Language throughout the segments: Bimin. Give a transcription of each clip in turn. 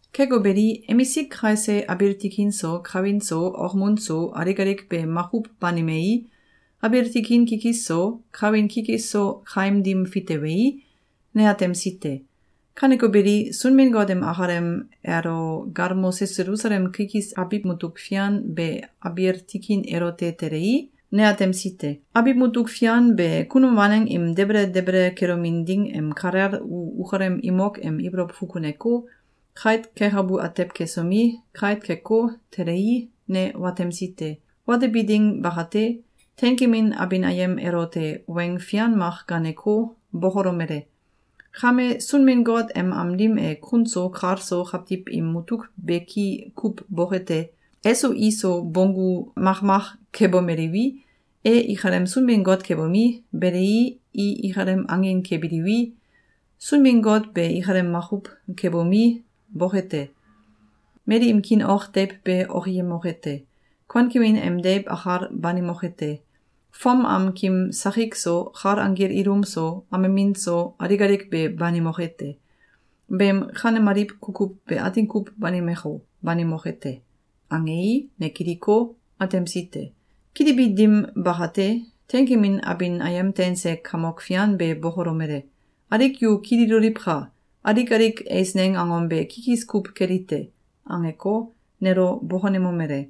Keko beli, emsik kaise abiil tikin so, kawin so, okmun so, alik alik be makuw banimei, abiil tikin kikis so, kawin kikis so kaim dim fitewei, ne atemsi te. Kaneko beli, Sunbin-Got em akalem elo galmose Selusalem kikis abiw mutuk fian be abiil tikin elote telei, ne atemsi te. Abiw mutuk fian be kunum waneng im debele debele kelomin ding em kalel u ukalem imok em ibolow fukuneko, kait kekabu atew kesomi, kait keko, telei, ne watemsi te. Watebi ding bakate, teinkemin abin ayem elote weng fian mak gaaneko, bokolomele: “Kame, Sunbin-Got em am dim e kun so kal so kawtiw im mutuk beki kuw boke te. Eso iso bonggu makmak kebomeliwi, e ikalem Sunbin-Got kebomi, belei, i akalem angin kebiliwi, Sunbin-Got be ikalem makuw kebomi, boke te. Mali im kiin ok deiw be okiyemoke te. Kuankemin em deiw akal banimoke te. Fom am kim sakik so, kal anggil ilum so, amemin so, alik alik be banimoke te. Beem kanemaliw kukuw be atin kuw banimeko, banimoke te.”, angei, ne kiliko, atemsi te. Kilibi dim bakate, teinkemin abin ayem teinse Kamok Fian be bokolomele: “Alik yu kililoliwka! Alik alik eisneng angom be kikis kuw keli te.”, angeko, nelo bokonemomele: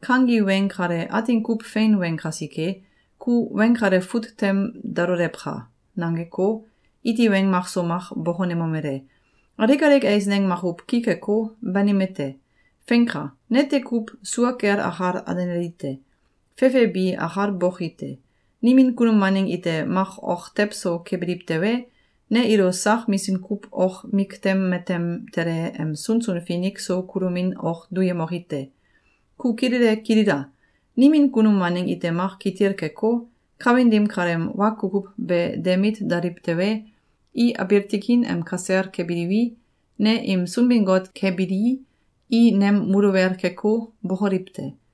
“Kangi weng kale atin kuw fein weng kasike, ku weng kale fut tem dalolewka!”, nangeko, iti weng makso mak bokonemomele: “Alik alik eisneng makuw ki keko, banime te! Feinka! Nete kuw sua kel akal alenali te. Fefe bi akal boki te. Nimin kunum waneng ite mak ok tew so kebiliw tewe, ne ilo sak misim kuw ok miktem matem tele em sunsun finik so kulomin ok duyemoki te. Ku kilele kilila! Nimin kunum waneng ite mak kitil keko, kawin dim kaleem wa kukuw be de mit daliw tewe, i abiil tikin em kasel kebiliwi, ne im Sunbin-Got kebilii, i nem muluwel keko, bokoliw te.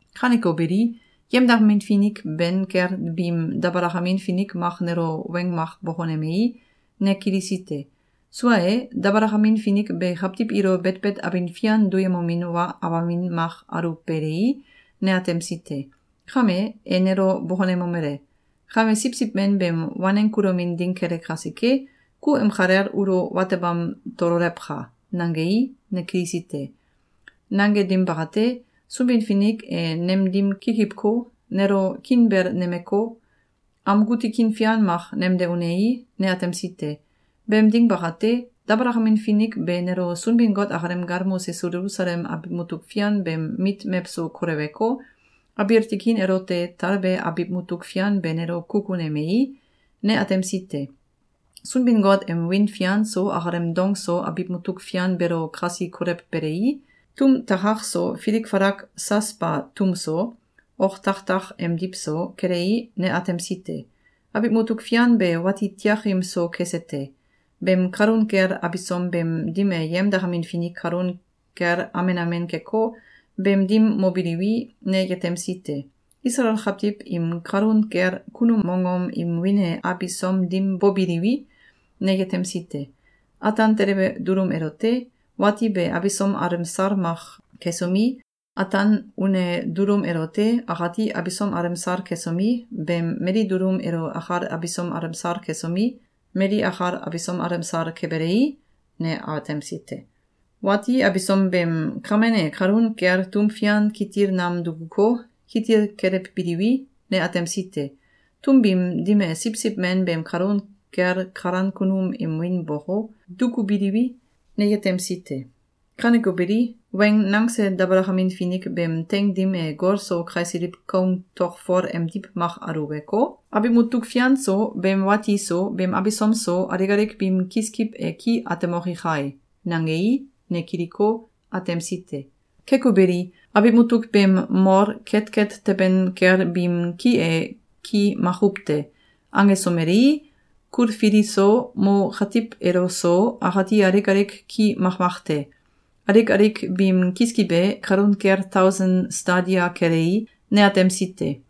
Kaneko beli, yemdakamin finik ben kel biim dabalakamin finik mak nelo weng mak bokonemei, ne kilisi te. Sua e, dabalakamin finik be kawtiw ilo betbet abin fian duyemomin wa awamin mak aluwbelei, ne atemsi te. Kame, e nelo bokonemomele: “Kame Siwsiw Men beem waneng kulomin ding kele kasike, ku em kalel ulo watebam tololewka!”, nangei, ne kilisi te. Nange dim bakate, Sunbin-Finik e nem dim kikiwko, nelo kiinbel nemeko, amgu tikin fian mak nemde unei, ne atemsi te. Beem ding bakate, dabalakamin finik be nelo Sunbin-Got akalem galmose Selusalem abiw mutuk fian beem mit mewso koleweko, abiil tikin elote talbe abiw mutuk fian be nelo kukunemei, ne atemsi te. Sunbin-Got em wiin fian so akalem dong so abiw mutuk fian beelo kasi kolewbelei, tum takak so filik falak “Sasba” tum so, oktakak emdiw so, kelei, ne atemsi te. Abiw mutuk fian be wati tiakim so kese te. Beem kalun kel abisom beem dim e yemdakamin finik kalun kel amen amen keko, beem dim mobiliwi, ne yetemsi te. Isalael kawtiw im kalun kel kunum mongom im wiin e abisom dim bobiliwi, ne yetemsi te. Ataan telebe dulum elote, wati be abisom alemsal mak kesomi, ataan une dulum elote, akati abisom alemsal kesomi, beem mali dulum elo akal abisom alemsal kesomi, mali akal abisom alemsal kebelei, ne atemsi te. Wati abisom beem kamen e kalun kel tum fian kitil nam dukuko, kitil kelewbiliwi, ne atemsi te. Tum biim dim e Siwsiw Men beem kalun kel kalan kunum im wiin boko, dukubiliwi, ne yetemsi te. Kaneko beli, weng nangse dabalakamin finik beem teing dim e gol so kaisiliw koung tokfol emdiw mak aluweko, “Abiw mutuk fian so, beem wati so, beem abisom so alik alik biim kiskiw e ki atemoki kai!”, nangei, ne kiliko, atemsi te. Keko beli, abiw mutuk beem mol ketket teben kel biim ki e ki makuw te. Angesomelei, kulfili so, mo katiw elo so, akati alik alik ki makmak te. Alik alik biim kiskiw e kalun kel tausen stadia kelei, ne atemsi te.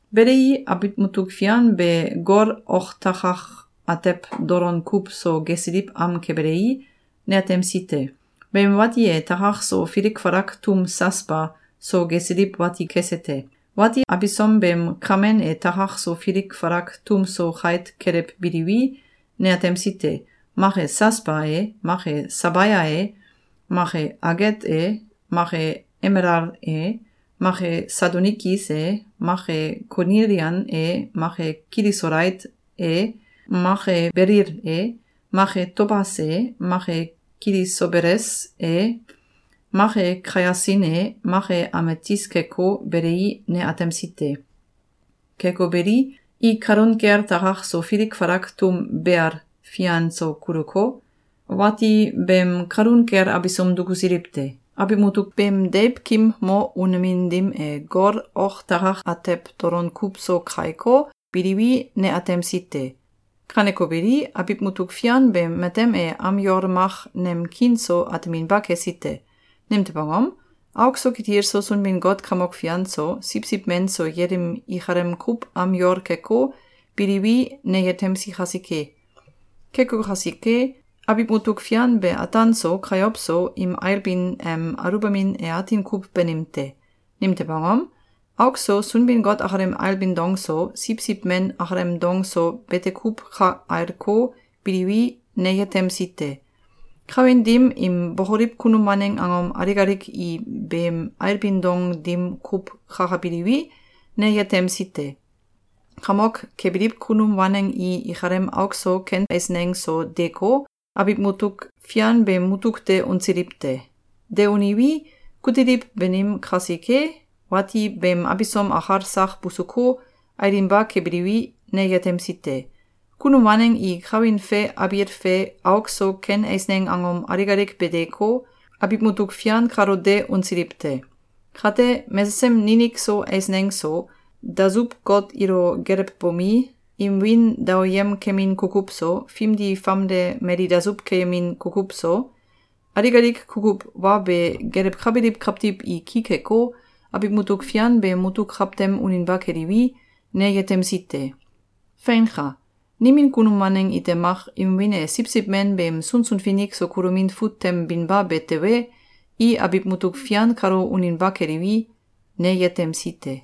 Belei, abiw mutuk fian be gol oktakak atew dolon kuw so gesiliw am kebelei, ne atemsi te. Beem wati e takak so filik falak tum “Sasba” so gesiliw wati kese te. Wati abisom beem kamen e takak so filik falak tum so kait kelewbiliwi, ne atemsi te. Mak e “Sasba” e, mak e “Sabaya” e, mak e “Aget” e, mak e “Emelal” e, mak e “Sadonikis” e, mak e “Konilian” e, mak e “Kilisolait” e, mak e “Belil” e, mak e “Tobas” e, mak e “Kilisobeles” e, mak e “Kayasin” e, mak e “Ametis” keko, belei, ne atemsi te. Keko beli, i kalun kel takak so filik falak tum “Beal” fian sel kuluko, wati beem kalun kel abisom dukusiliw te. Abiw mutuk beem deiwkim mo unemin dim e gol oktakak atew dolon kuw so kaiko, biliwi, ne atemsi te. Kaneko beli, abiw mutuk fian beem matem e am yol mak nem kiin so ateminba kesi te. Nimtew angom? Auk so kitil so Sunbin-Got Kamok Fian so, Siwsiw Men so yelim ikalem kuw am yol keko, biliwi, ne yetemsi kasike. Keko kasike, abiw mutuk fian be ataan so, kayow so, im ailbin em aluwbamin e atin kuw banim te. Nimtew angom? Auk so Sunbin-Got akalem ailbin dong so, Siwsiw Men akalem dong so bete kuw ka ailko, biliwi, ne yetemsi te. Kawin dim im bokoliw kunum waneng angom alik alik i beem ailbin dong dim kuw kakabiliwi, ne yetemsi te. Kamok kebiliw kunum waneng i ikalem auk so ken eisneng so deeko, abiw mutuk fian beem mutuk de unsiliw te. De uniwi, kutiliw banim kasike, wati beem abisom akal sak busuko, ailinba kebiliwi, ne yetemsi te. Kunum waneng i kawin fe abiil fe auk so ken eisneng angom alik alik be deeko, abiw mutuk fian kalo de unsiliw te. Kate, mesesem ninik so eisneng so, dasuw-got ilo gelewbomi, im wiin daoyem kemin kukuw so, fimdi famde mali dasuw keyemin kukuw so, alik alik kukuw wa be gelewkabiliw kawtiw i ki keko, abiw mutuk fian beem mutuk kawtem uninba keliwi, ne yetemsi te. Feinka! Nimin kunum waneng ite mak im wiin e Siwsiw Men beem sunsun finik so kulomin fut tem binba be tewe, i abiw mutuk fian kalo uninba keliwi, ne yetemsi te.